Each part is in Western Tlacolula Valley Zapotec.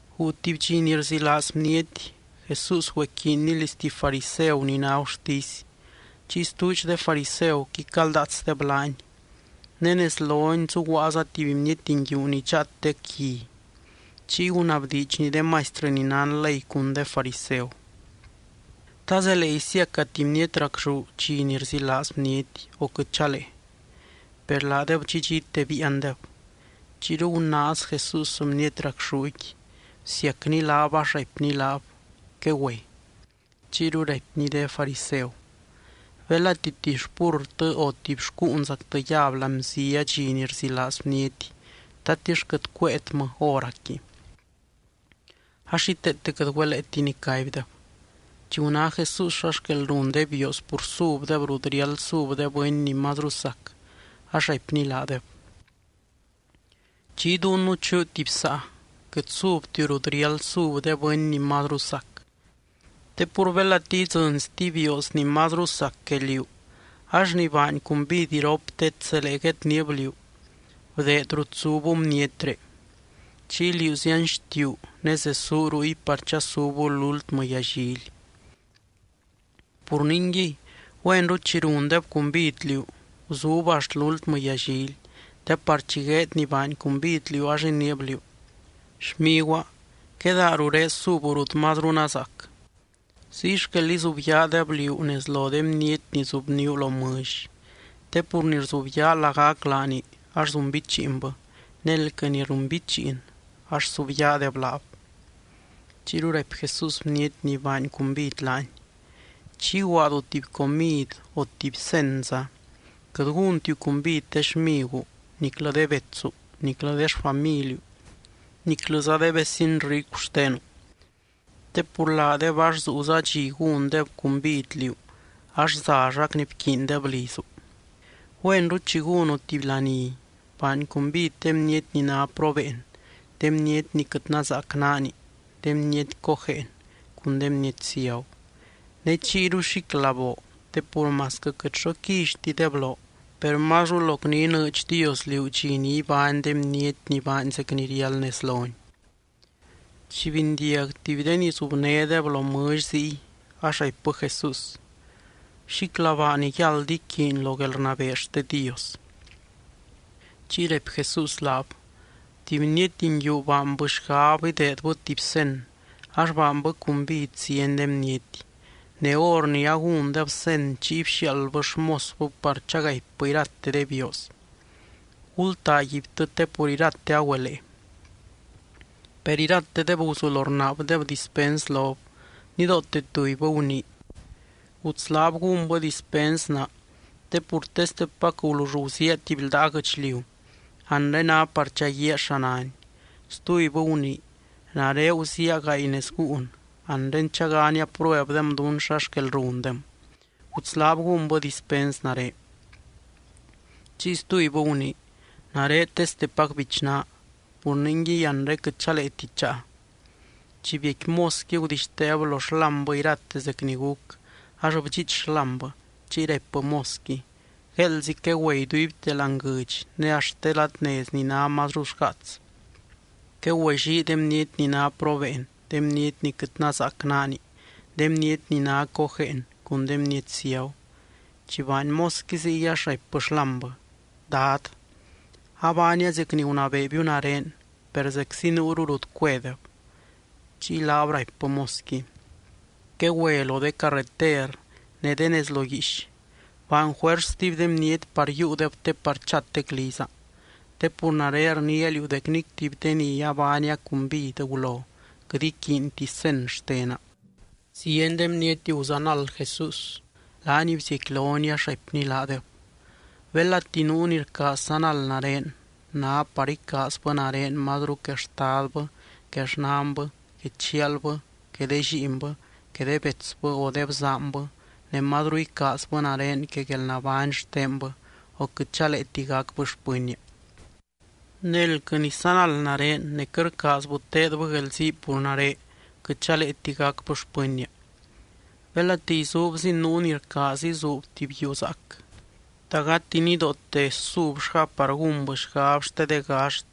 Guu tuby dxi ni rzilaaz bniety, Jesús güequiinny liz tuby fariseu ni ná gurtisy. Chiy stuudx de fariseuqui caldaatsdeb laany. Ne nez lony zuguaaza tuby bniety nguiu ni dxaatec gui. Chiy gunabdiidxny de maistrɨ ni nán ley cun de fariseu: —¿Ta zelee isiaca tuby bniety racxú dxi ni rzilaaz bniety, o quɨt chalee? Per laadeb dxidxite biiandeb. Chiyru gunaaz Jesús bniety racxúqui, bsiacny laab ax raipny laab, quegüe. Chiyru raipny de fariseu: —Belati tuby xpurrtɨ o tuby xcúunzactɨ yab láani bzia dxi ni rzilaaz bniety, ¿tatix quɨt cuéetmɨ hóracqui? Ax xíteete quɨt güeleeti nicaibdeb. Chi guná Jesús xa xquel run de bioos pur subdeb rut riáld sub de bɨny ni mazru sac, ax raipny laadeb: —Chi iduunu chuu tuby saa, quɨt subtiu rut riáld sub de bɨny ni mazru sac. Te pur belati idzɨny stuby bioos ni mazru sac que liú ax ni baany cumbid iroptet zelee guedniib liú: “Bdeed rut zubu bnietré.” Chiy liú zianxtiuu ne zesuu ruy par chasubu lúltmɨ yallily. Pur ningui, güenru chi rundeb cumbid liú, guzub axt lúltmɨ yallily, te par chi gueed ni baany cumbid liú ax iniib liú: “Xmiguaa, quedaa ruré subu rut mazru nazaac.” Ziy xquel izubyaadeb liú nez lo de bniety ni zubníu lo mɨlly. Te pur ni rzubyaa lagac laani ax zunbichiinbɨ ne elquɨ ni runbichiin ax subyaadeb laab. Chiyru raipy Jesús bniety ni baany cumbid laany: —Chi iguaadu tuby comid o tuby cenza, quɨt gúntiu cumbid de xmiguu, niclɨ de betsu, niclɨ de xfamiliu, niclɨza de vecin ricu xtenu. Te pur laadeb ax zuuza dxi gúndeb cumbid liú ax zallac ni bquiindeb lizu. Güenru, chi gúnu tuby laní, baany cumbid de bniety ni ná probeen, de bniety ni quɨt nazaac naani, de bniety cojeen, cun de bniety ciagu. Ne chiyru xíclaboo te pur masquɨ quɨt xo quillytideb loo, per mazru loc ni inɨɨdx Dios liú dxi ni ibány de bniety ni baany zec ni riáld nez lony. Chi bindiag tuby de ni zubnédeb lo mɨlly ziy, ax raipbɨ Jesús: —Xíclabaa ni yáld iquiiny lo guelrnabee xte Dios. Chiy raipy Jesús laab: —Tuby bniety nguiu baanbɨ xgab ideedbɨ tuby cen, ax baanbɨ cumbid zieny de bniety. Ne hor ni agúndeb cen chiy bxiaaldbɨ xmosbɨ par chagaipbɨ irate de bioos: “Gultaaguibtɨ te pur irate agüelee.” Per iratedeb guzulo rnaabdeb dispens lob. Nidoote tubybɨ gunii: “Gutslaab gúnbɨ dispens naa te pur testepac gulull guziaa tuby ldaa guɨchliu. Anre ná par chaguíaa xa náni.” Stubybɨ gunii: “Nare guziaa gaay nez gúun. Anre chagania pruebdem dún xa xquel rundem. Gutslaab gúnbɨ dispens nare.” Chiy stubybɨ gunii: “Nare testepac bichnaa. Pur ningui, anre quɨt chaleeti cháa.” Chi biecqui mosqui, gudixteeb lo xlámbɨ irate zec ni guc. Ax bdxiich xlámbɨ. Chiy raipbɨ mosqui: “Gueeldzi quegüe iduibte láani guɨdx ne axt de ladnez ni ná mazru xgaats. Quegüellii de bniety ni ná probeen, de bniety ni quɨt nazaac naani, de bniety ni ná cojeen cun de bniety ciagu.” Chi baany mosqui ziy ax raipbɨ xlámbɨ: “Dad, abaania zec ni gunabeebiu nare, per zeczi nuuru rut cuedeb.” Chiy laab raipbɨ mosqui: “Quegüe lo de carreter ne de nez lo guiix. Baany juers stuby de bniety par yiiudeb te par chatec liza, te pur nare rniia liú dec nic tuby de ni baania cumbid gulo quɨt iquiinti cen xtena.” Zieny de bniety guzanald Jesús. Laany bziecquilony ax raipny laadeb: —Belati nuu ni rcaaz sanald nare, ná par icaazbɨ nare mazru que xtadbɨ, que xnanbɨ, que chialbɨ que de lliinbɨ, que de betsbɨ o de bzaanbɨ, ne mazru icaazbɨ nare que guelnabány xtenbɨ o quɨt chaleeti gacbɨ xpɨnnia. Ne elquɨ ni sanald nare ne quɨt rcaazbɨ teedbɨ guelzii pur nare, quɨt chaleeti gacbɨ xpɨnnia. Belati izuubzin nuu ni rcaaz izuub tuby yuu zaac, ¿ta gati nidoote subllgáb par gúnbɨ xgab xte de gaxt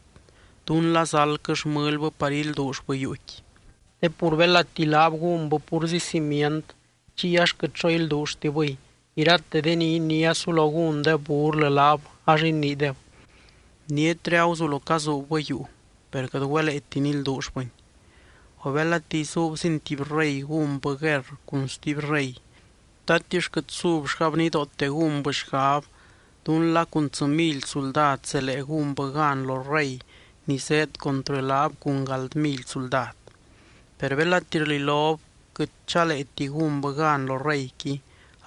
dún la zaldquɨ xmɨlbɨ par ilduullbɨ yuuqui? Te pur belati laab gúnbɨ púrzi cimient, chiy ax quɨt xo ilduulltibɨy, irate de ni iniá sulo gúndeb burlɨ laab ax iniideb: “Bnietre aguzulo cazuubbɨ yuu, per quɨt güeleeti nilduullbɨni.” O belati izuubzin tuby rey gúnbɨ guerr cun stuby rey, ¿tatix quɨt subllgáb nidoote gúnbɨ xgab dún la cun tsɨ mily suldad zelee gúnbɨ gan lo rey ni zéed contrɨ laab cun gáld mily suldad? Per belati rlilob quɨt chaleeti gúnbɨ gan lo reyqui,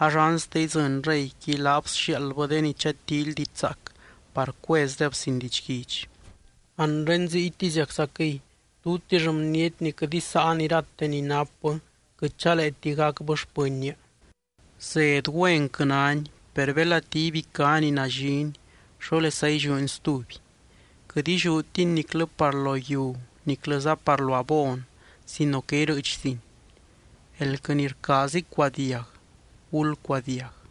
ax anste idzɨny reyqui, laab sxiaaldbɨ de ni chatíily diidx zaac par cuezdeb sin didxguidx. Anre ziytiziaczaquɨy tutix bniety ni quɨt isáan irate ni napbɨ, quɨt chaleeti gacbɨ xpɨnnia. ’Zed güenquɨ náni. Per belati ibicá ni nallini, ¿xólesa illiúni stuby? Quɨt illiútini niclɨ par lo yiu niclɨza par lo abon sino que irɨɨchzin. Elquɨ ni rcaaz icuadiag, gulcuadiag.